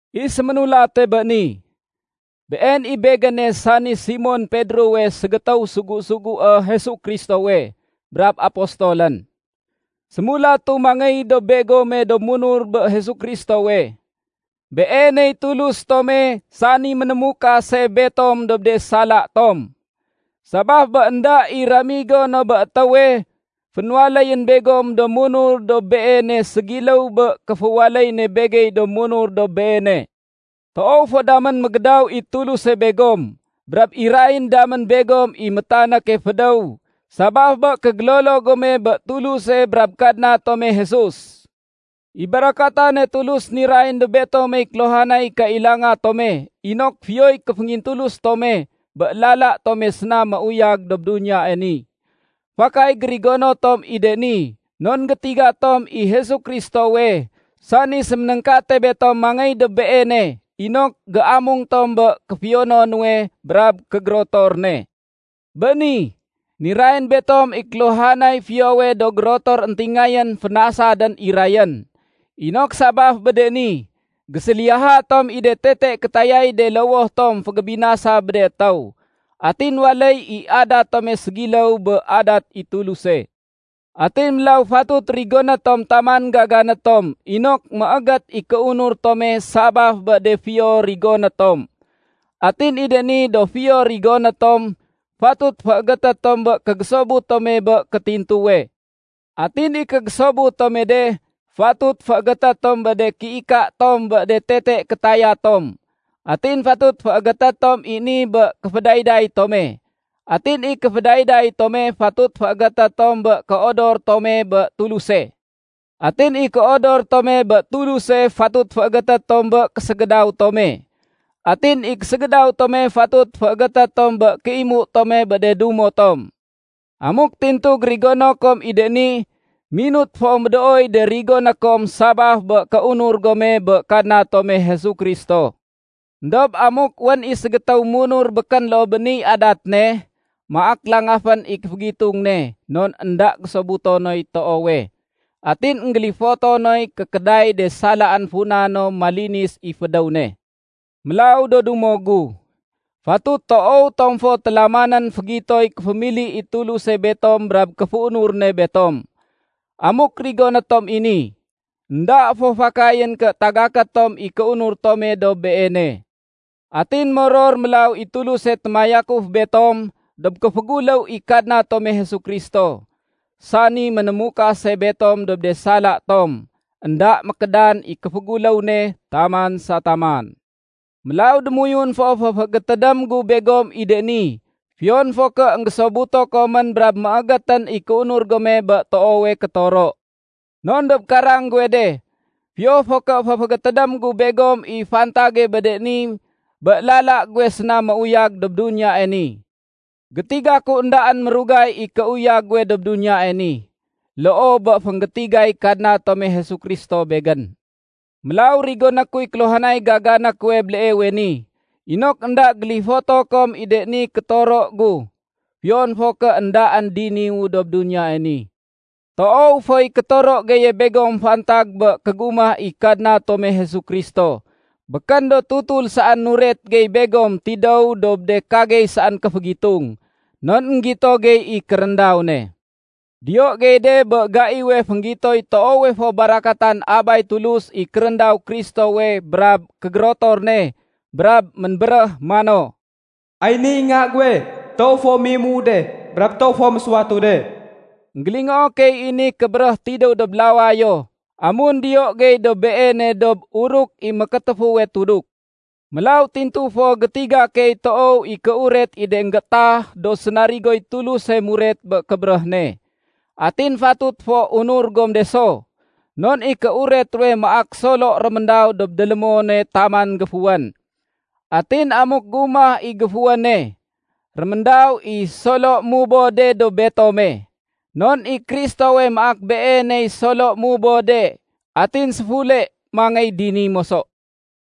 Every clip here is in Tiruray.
I séménulate bé ni, been i begéne sani Simon Pedrowe ségétéw sugu-sugué Jesu Kristowe brab apostolén. Sémulatu mangéy dob begome do munur bé Jesu Kristowe. Beeney Tulus tome sani ménémukase betom dob de sala tom. Sabaf bé énda i ramigo no bé étéwe, fénwaléyén begom do munur dob Beene ségiléw bé kéféwaléy ne begey do munur dob Beene. Toow fo damén mégédaw i Tuluse begom brab irayén damén begom i métanéke fédéw sabaf bé kégélolo gome bé Tuluse brab Kadna tome Jesus. I barakatane Tulus nirayén dob betomey kéluhanay kailanga tome inok fiyoy kéféngintulus tome bé lala tome séna méuyag dob duniyae ni. Fakay gérigono tom i de ni non gétiga tom i Jesu Kristowe, sani séménéngkate betom mangéy dob Beene inok géamung tom bé kéfiyono nuwe brab kégérotor ne. Bé ni, nirayén betom i kéluhanay fiyowe do gérotor éntingayén fénasadén irayén, inok sabaf bé de ni, géséliyaha tom i de tete kétayay de lowoh tom fégébinasa bé de étéw. Atin waléy i adat tome ségiléw bé adat i Tuluse. Atin mélaw fatut rigoné tom taman gagané tom inok méégét i kéunur tome sabaf bé de fiyo rigoné tom. Atin i de ni do fiyo rigoné tom, fatut féégété tom bé kégésobut tome bé kétintuwe. Atin i kégésobut tome de, fatut féégété tom bé de kéika tom bé de tete kétaya tom. Atin fatut féégété tom i ni bé kéfédayday tome. Atin i kéfédayday tome, fatut féégété tom bé kéodor tome bé Tuluse. Atin i kéodor tome bé Tuluse, fatut féégété tom bé késégédaw tome. Atin i késégédaw tome, fatut féégété tom bé kéimu tome bé de dumo tom. Amuk tintu gérigono kom i de ni, minut fo médooy de rigoné kom sabaf bé kéunur gome bé Kadna tome Jesu Kristo. Endob amuk wén i ségétéw munur békén loo bé niy adat ne, maak langafén i kéfégitung ne non énda gésobuto noy toowe, atin énggélifoto noy kékéday de salaén funa no malinis i fédéw ne. Mélaw do dumo gu, fatut toow tom fo télamanén fégitoy kéfémili i Tuluse betom brab kéféunur ne betom. Amuk rigoné tom i ni, énda fo fakayén ké tagaké tom i kéunur tome dob Beene. Atin moror mélaw i Tuluse témayakuf betom dob kéféguléw i Kadna tome Jesu Kristo, sani ménémukase betom dob de sala tom. Enda mékédan i kéféguléw ne taman sa taman. Mélaw démoyun fo féfégétédém gu begom i de ni fiyon fo ké énggésobuto komén brab méégétén i kéunur gome bé toowe kétoro. Non dob karang guwe de, fiyo fo ké féfégétédém gu begom i fantage bé de ni bé lala guwe séna méuyag dob duniyae ni. Gétiga ku éndaén mérugay i kéuyag guwe dob duniyae ni, loo bé fénggétigay Kadna tome Jesu Kristo begén. Mélaw rigoné kuy kéluhanay gagané kuwe béleewe ni inok énda gélifoto kom i de ni kétoro gu, fiyon fo ké éndaén diniwu dob duniyae ni. Toow foy kétoro geye begom fantag bé kégumah i Kadna tome Jesu Kristo. Békén do tutul saén nuret gey begom tidéw dob de kagey saén kéfégitung, non énggito gey i kéréndaw ne. Diyo gey de bé gaiwe fénggitoy toowe fo barakatan Abay Tulus i kéréndaw Kristowe brab kégérotor ne brab ménbéréh mano, “Ay niy Nga guwe toow fo méimuu de, brab toow fo mésuwatu de.” Enggélingoo key i ni kébéréh tidéw dob lawayo amun diyo gey dob Beene dob uruk i mékétéfuwe tuduk. Mélaw tintu fo gétiga key toow i kéuret i de énggéétah do sénarigoy Tuluse muret bé kébéréh ne. Atin fatut fo unur gom de so, non i kéuret ruwe maak solo réméndaw dob délémone taman géfuwén. Atin amuk gumah i géfuwéne, réméndaw i solo mubode dob betome. Non i Kristowe maak Beeney solo mubode atin séfule mangéy dini moso.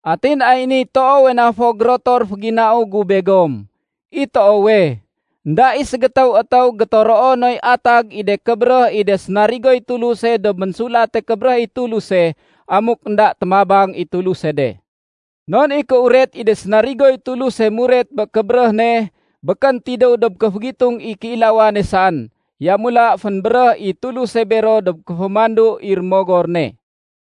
Atin ay niy toowe na fo gérotor féginau gu begom: I toowe, énda i ségétéw étéw gétoroo noy atag i de kébéréh i de sénarigoy Tuluse dob Ménsulate Kébéréh i Tuluse, amuk énda témabang i Tuluse de. Non i kéuret i de sénarigoy Tuluse muret bé kébéréh ne békén tidéw dob kéfégitung i kéilawane saén. Yamula fénbéréh i Tuluse bero dob kéfémandu i Rémogor ne.